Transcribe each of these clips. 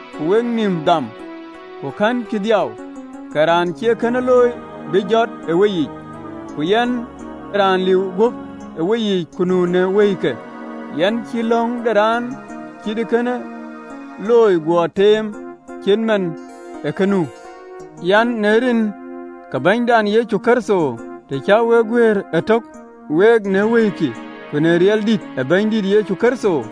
Ku we ë nïïm dham, ku kɛ̈nkï dhiau, ke raan cï ee kënë looi bï jɔt ë weyiic. Ku yɛn, raan liu guöp ë weyiic, ku nuö në wëikï, yɛn cï löŋ de raan cï ee kënë looi guɔ teem, cït man ë kë ë nu, an, në rin ke Bɛ̈nydan Yecu Kërtho, të cä wek guëër ëtök, week në wëikï, ku në riɛldïït ë Bɛ̈nydït Yecu Kërtho,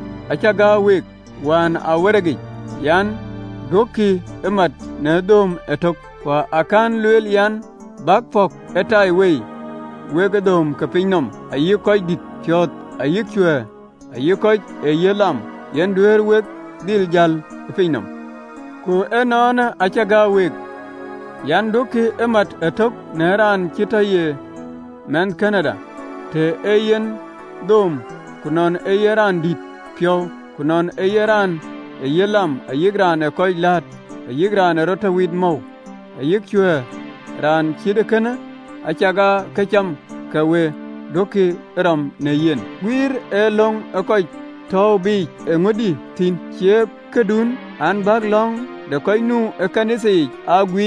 Acä gäär week wään ë awerekic an: Duökï ee mat në dhööm ëtök, ku akɛ̈n lueel an, bäk pɔ̈k ëtaiwei wekë dhööm ke piny nɔm, ayï röördït piɔ̈ɔ̈th, ayï cuɛ̈ɛ̈r, ayï kɔc ee yiëth lam, yen aduɛ̈ɛ̈r wek dhil jäl ë piny nɔm. Ku ënɔɔnë, acä gäär week an: Duökï ee mat ëtök në raan cï tɔ ye mɛnhkënëda, të ee yen dhööm, ku nɔn ee yen raan dït piɔ̈u, ku nɔn ee yen raan ë yiëth lam, ayï raan ee kɔc läät, ayï raan ee rɔt tɔ wit ë mɔu, ayï cuɛ̈ɛ̈r, raan cït ee kënë, acakaa këcam, ke we duökï rɔ̈m në yen. Guiëër ë löŋ ë kɔc tɔ̈u biic eeŋödï thïn? Cie këdun an, bäk löŋ de kɔc nu ɣön ë Nhialic yic guiir?